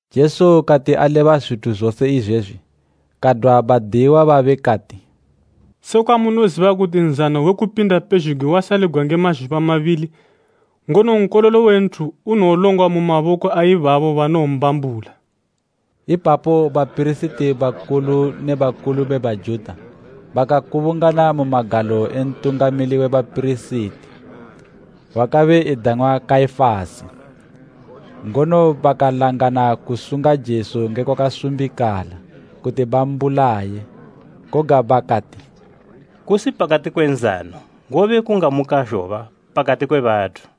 Jesu kati aleba zwithu zose izwezwi, kadwa badiyiwa babe kati, “Sekwa munoziba kuti Nzano we Kupinda pezhugwi wasaligwa nge mazhuba mabili, ngono Nkololo we Nthu unowolongwa mu maboko a ibabo banowombambula.” Ipapo bapirisiti bakulu ne bakulu be Bajuta bakakubungana mu magalo e Ntungamili we bapirisiti wakabe edang'wa Kaifasi, ngono bakalangana kusunga Jesu nge kwakasumbikala kuti bambulaye. Koga bakati, “Kusi pakati kwe nzano, ngobe kungamuka zhoba pakati kwe bathu.”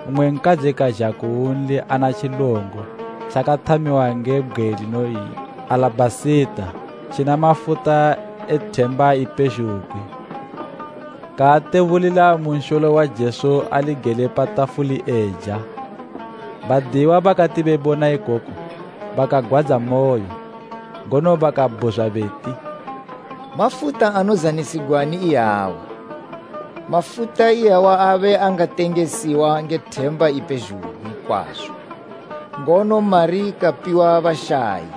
mmwe nkadzi kazha kunli ana tjilongo tjakathamiwa nge bgwe linoyi alabhasita tjina mafuta e themba ipezhugwi kaatebulila mu nsholo wa Jesu ali gele pa tafuli eja. 8Badiyiwa bakati bebona ikoko bakagwadzamoyo, ngono bakabhuzwa beti, “Mafuta anozanisigwani iyawa? Mafuta iyawa abe angatengesiwa nge themba ipezhugwi kwazo, ngono mari kapiwa bashayi.”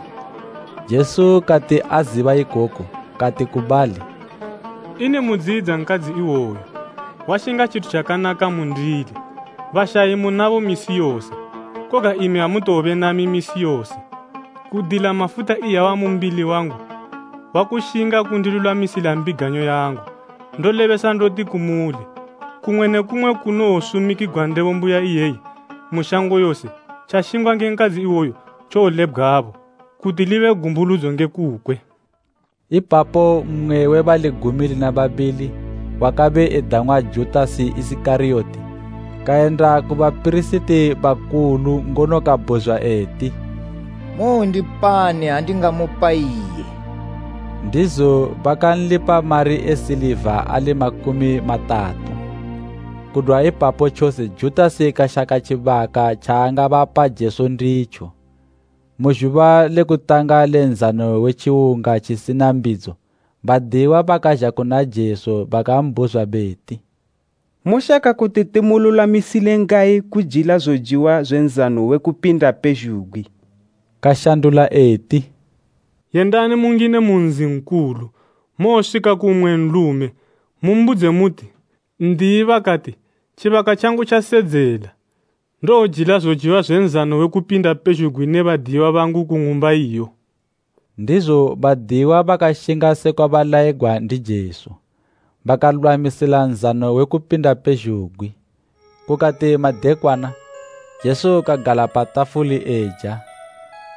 Jesu kati aziba ikoku, kati ku bali, “Ini mudziyidza nkadzi iwoyu? Washinga tjithu tjakanaka mundili. Bashayi munabo misi yose, koga imi amutowobe nami misi yose. Kudila mafuta iyawa mu mbili wangu, wakushinga kundilulwamisila mbiganyo yangu. Ndolebesa ndoti kumuli, kumwe ne kumwe kunowosumikigwa Ndebo mbuya iyeyi mu shango yose, tjashingwa nge nkadzi iwoyu tjowolebgwabo, kuti libe gumbuludzo nge kukwe.” Ipapo mmwe we bali gumi lina babili, wakabe edang'wa Judasi Isikariyoti, kayenda ku bapirisiti bakulu ngono kabhuzwa eti, “Mowondipani ha ndingamupa iye?” Ndizo bakanlipa mari e siliva ali makumi matatu. Kudwa ipapo tjose Judasi kashaka tjibaka tjaangabapa Jesu nditjo. Mu zhuba le kutanga le Nzano we Tjiwunga tjisina mbidzo badiyiwa bakazha kuna Jesu bakambhuzwa beti, “Moshaka kuti timululwamisile ngayi kujila zojiwa zwe Nzano we Kupinda pezhugwi?” Kashandula eti, “Yendani mungine mu nzi nkulu, mowoswika ku mmwe nlume, mumbudze muti, ‘N'diyi bakati, tjibaka tjangu tjasedzela. Ndowojila zojiwa zwe Nzano we Kupinda pezhugwi ne badiyiwa bangu ku ng'umba iyo.’” Ndizo badiyiwa bakashinga sekwa balayigwa ndi Jesu, bakalulwamisa zojiwa zwe Kupinda pezhugwi. Kukati madekwana, Jesu kagala pa tafuli eja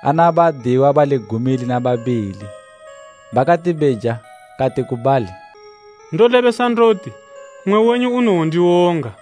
ana badiyiwa bali gumi lina babili. Bakati beja kati ku bali, “Ndolebesa ndoti, mmwe wenyu unowondiwonga.”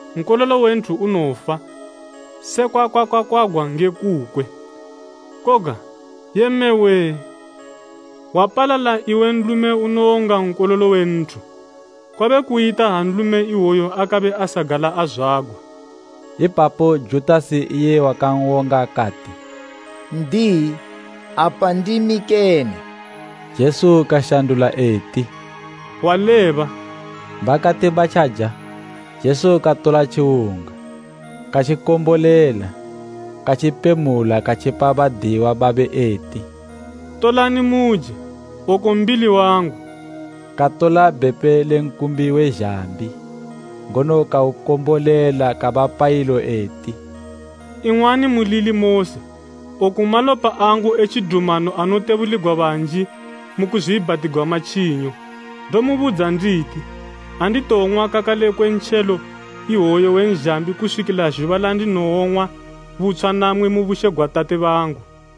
Nkololo we Nthu unowofa sekwa kwakakwagwa nge kukwe. Koga Yee mme wee! Wapalala iwe nlume unowonga Nkololo we Nthu! Kwabe kuyita ha nlume iwoyo akabe asagala azwagwa.” Ipapo Judasi iye wakan'wonga kati, “N'diyi, apa ndimi kene?” Jesu kashandula eti, “Waleba.” Bakati batjaja, Jesu katola tjiwunga, katjikombolela, katjipemula katjipa badiyiwa babe eti, “Tolani muje, oku mbili wangu.” Katola bhepe le nkumbi we zhambi, ngono kaukombolela kabapa ilo eti, “Ing'wani mulili mose. Oku malopa angu e tjidumano anotebuligwa banji mu kuzwiibhatigwa matjinyo. Ndomubudza nditi, anditowong'wa kakale kwe ntjelo iwoyu we nzhambi kuswikila zhuba landinowoung'wa butshwa namwi mu bushe gwa Tate bangu.”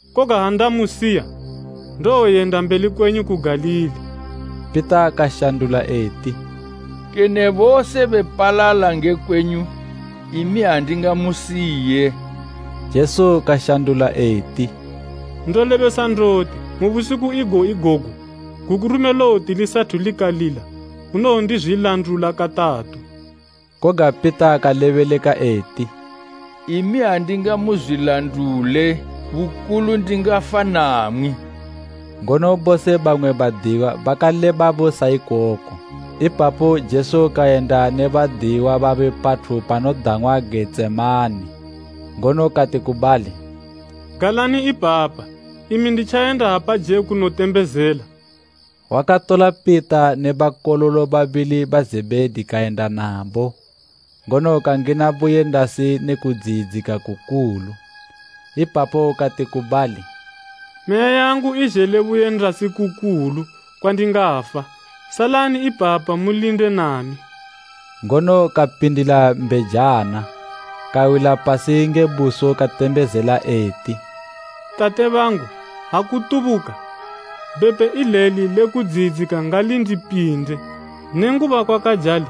Koga ha ndamusiwa ndowoyenda mbeli kwenyu ku Galili.” Pita kashandula eti, “Kene bose bepalala nge kwenyu, imi andingamusiye.” Jesu kashandula eti, “Ndolebesa ndoti, mu busiku igo igogu, gukurume lowoti lisathu likalila, unowondizwilandula katatu.” Koga Pita kalebeleka eti, “Imi andingamuzwilandule bukulu ndingafa namwi.” Ngono bose bamwe badiyiwa bakalebabo sa ikoko. Ipapo Jesu kayenda ne badiyiwa babe pathu panodang'wa Getsemane, ngono kati ku bali, “Galani ipapa imi nditjayenda apaje kunotembezela.” Wakatola Pita ne bakololo babili ba Zebhedi kayenda nabo, ngono kangina buyendasi ne kudziyidzika kukulu. Ipapo kati ku bali, “Meya yangu izhele buyendasi kukulu kwandingafa. Salani ipapa mulinde nami.” Ngono kapindila mbejana kawila pasi nge buso katembezela eti, “Tate bangu ha kutubuka, bhepe ileli le kudziyidzika ngalindipinde. Nenguba kwakajalo,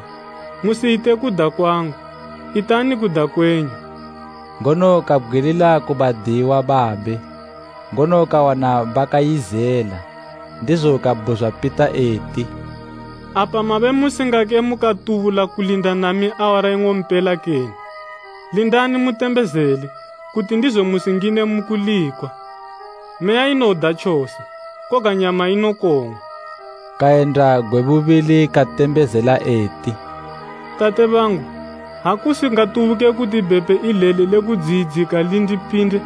musiyite kuda kwangu, itani kuda kwenyu.” Ngono kabgwilila ku badiyiwa babe, ngono kawana bakayizela, ndizo kabhuzwa Pita eti, “Apa mabe musingake mukatubula kulinda nami awara ing'ompela kene? Lindani mutembezele, kuti ndizo musingine mu kulikwa. Meya inoda tjose, koga nyama inokong'wa.” Kayenda gwe bubili katembezela eti, “Tate bangu, ha kusingatubuke kuti bhepe ileli lekudziyidzika lindipinde,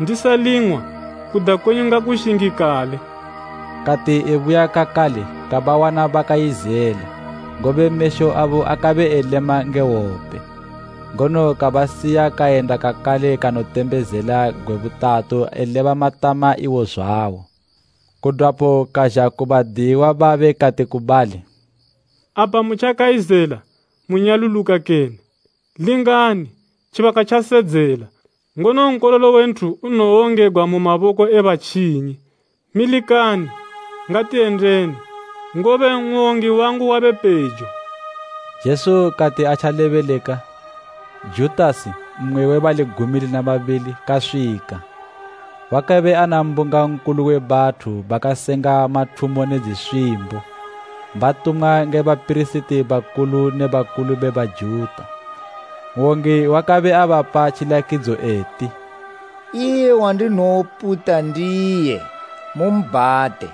ndisaling'wa, kuda kwenyu ngakushingikale.” Kati ebuya kakale kabawana bakayizela, ngobe mesho abo akabe elema nge hwope. Ngono kabasiya kayenda kakale kanotembezela gwe butatu eleba matama iwo zwawo. Kudwapo kazha ku badiyiwa babe kati ku bali, “Apa mutjakayizela munyaluluka kene? Lingani, tjibaka tjasedzela, ngono Nkololo we Nthu unowongegwa mu maboko e batjinyi. Milikani, ngatiyendeni, ngobe n'wongi wangu wabe pejo.” Jesu kati atjalebeleka, Judasi, mmwe we bali gumi lina babili, kaswika. Wakabe ana mbunga nkulu we bathu bakasenga mathumo ne dziswimbo, batumwa nge bapirisiti bakulu ne bakulu be Bajuta. N'wongi wakabe abapa tjilakidzo eti, “Iye wandinowoputa ndiye, mumbhate.”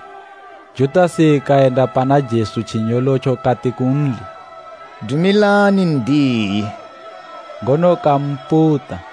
Judasi kayenda pana Jesu tjinyolotjo kati kunli, “Dumilani N'diyi!” Ngono kamputa.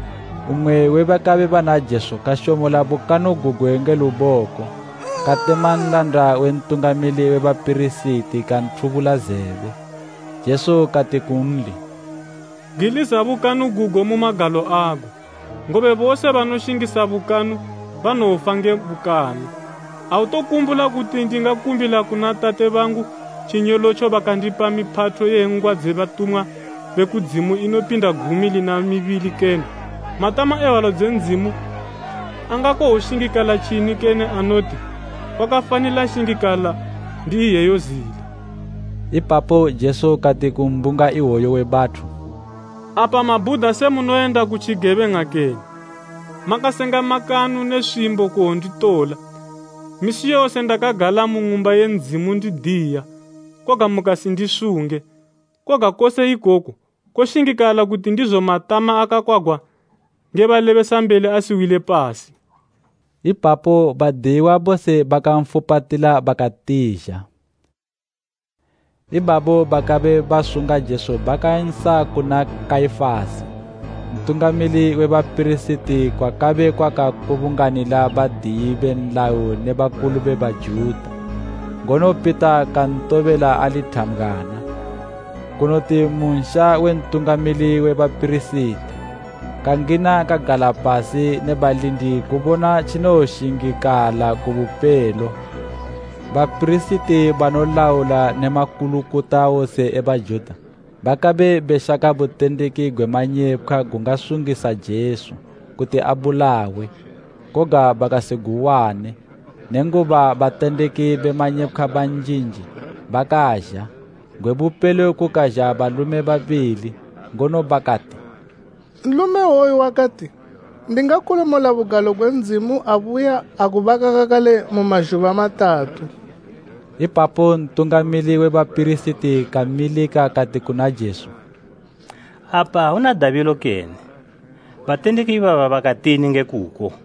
Mmwe we bakabe bana Jesu kashomola bukanu gugwe nge luboko, katema nlanda we mpirisiti nkulu kanthubula zebe. Jesu kati kunli, “Bgwiliza bukanu gugo mu magalo ago, ngobe bose banoshingisa bukanu banowofa nge bukanu. Autokumbula kuti ndingakumbila kuna tate bangu, tjinyolotjo bakandipa miphatho ye ngwa dze batumwa be kudzimu inopinda gumi lina mibili kene? Matama e hwalo dze Ndzimu angakowoshingikala tjini kene anoti, kwakafanila shingikala ndi iyeyo zila.” Ipapo Jesu kati ku mbunga iwoyu we bathu, “Apa mabhuda se munoyenda ku tjigebeng'a kene, makasenga makanu ne swimbo kuwonditola? Misi yose ndakagala mu Ng'umba ye Ndzimu ndidiya, koga mukasindisunge. Koga kose ikoku koshingikala kuti ndizo matama akakwagwa nge balebesambeli asiwile pasi.” Ipapo badiyiwa bose bakanfupatila bakatizha. Ibabo bakabe basunga Jesu bakansa kuna Kaifasi Ntungamili we bapirisiti kwakabe kwakakubunganila badiyi be nlayo ne bakulu be Bajuta. Ngono Pita kantobela ali thambgwana kunoti mu nsha we Ntungamili we bapirisiti. Kangina kagala pasi ne balindi kubona tjinowoshingikala ku bupelo. Bapirisiti banolaula ne makulukota wose e Bajuta bakabe beshaka butendeki gwe manyepkhwa gungasungisa Jesu kuti abulawe, koga bakasiguwane, nenguba batendeki be manyepkhwa banjinji bakazha. Gwe bupelo kukazha balume babili, ngono bakati, “Nlume iwoyu wakati, ‘Ndingakolomola Ng'umba ye Ndzimu abuya agubaka kakale mu mazhuba matatu.’” Ipapo Ntungamili we bapirisiti kamilika kati kuna Jesu, “Apa auna dabilo kene? Batendeki ibaba bakatini nge kuko?”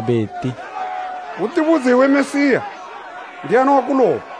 beti, “Utibudze iwe Mesiya. Ndiani wakuloba?”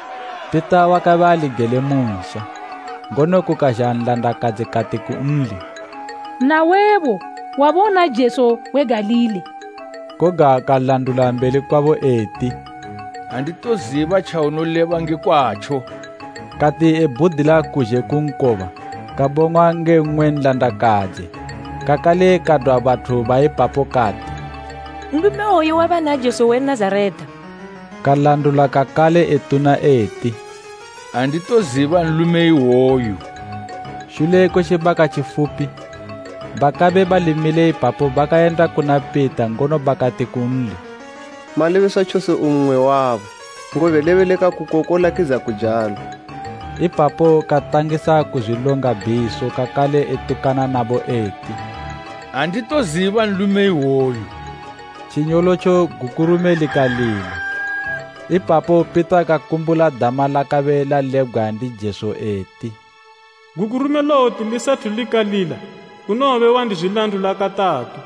Pita wakabe ali gele mu nsha, ngono kukazha nlandakadzi kati kunli, “Nawebo wabe una Jesu we Galili.” Koga kalandula mbeli kwabo eti, “Anditoziba tjaunoleba nge kwatjo.” Kati ebhudila kuzhe ku nkoba kabong'wa nge mmwe nlandakadzi, kakale kadwa bathu ba ipapo kati, “Nlume iwoyu wabe ana Jesu we Nazareta.” Kalandula kakale etuna eti, “Anditoziba nlume iwoyu!” Shule kwe tjibaka tjifupi, bakabe bali mile ipapo bakayenda kuna Pita ngono bakati kunli, “Malebeswa tjose u mmwe wabo, ngobe lebeleka kuko kolakidza kujalo!” Ipapo katangisa kuzwilonga bhiso kakale etukana nabo eti, “Anditoziba nlume iwoyu!” Tjinyolotjo gukurume likalila. Ipapo Pita kakumbula dama lakabe lalebgwa ndi Jesu eti, “Gukurume lowoti lisathu likalila unowobe wandizwilandula katatu.”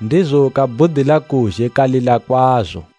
Ndizo kabhudila kuzhe kalila kwazo.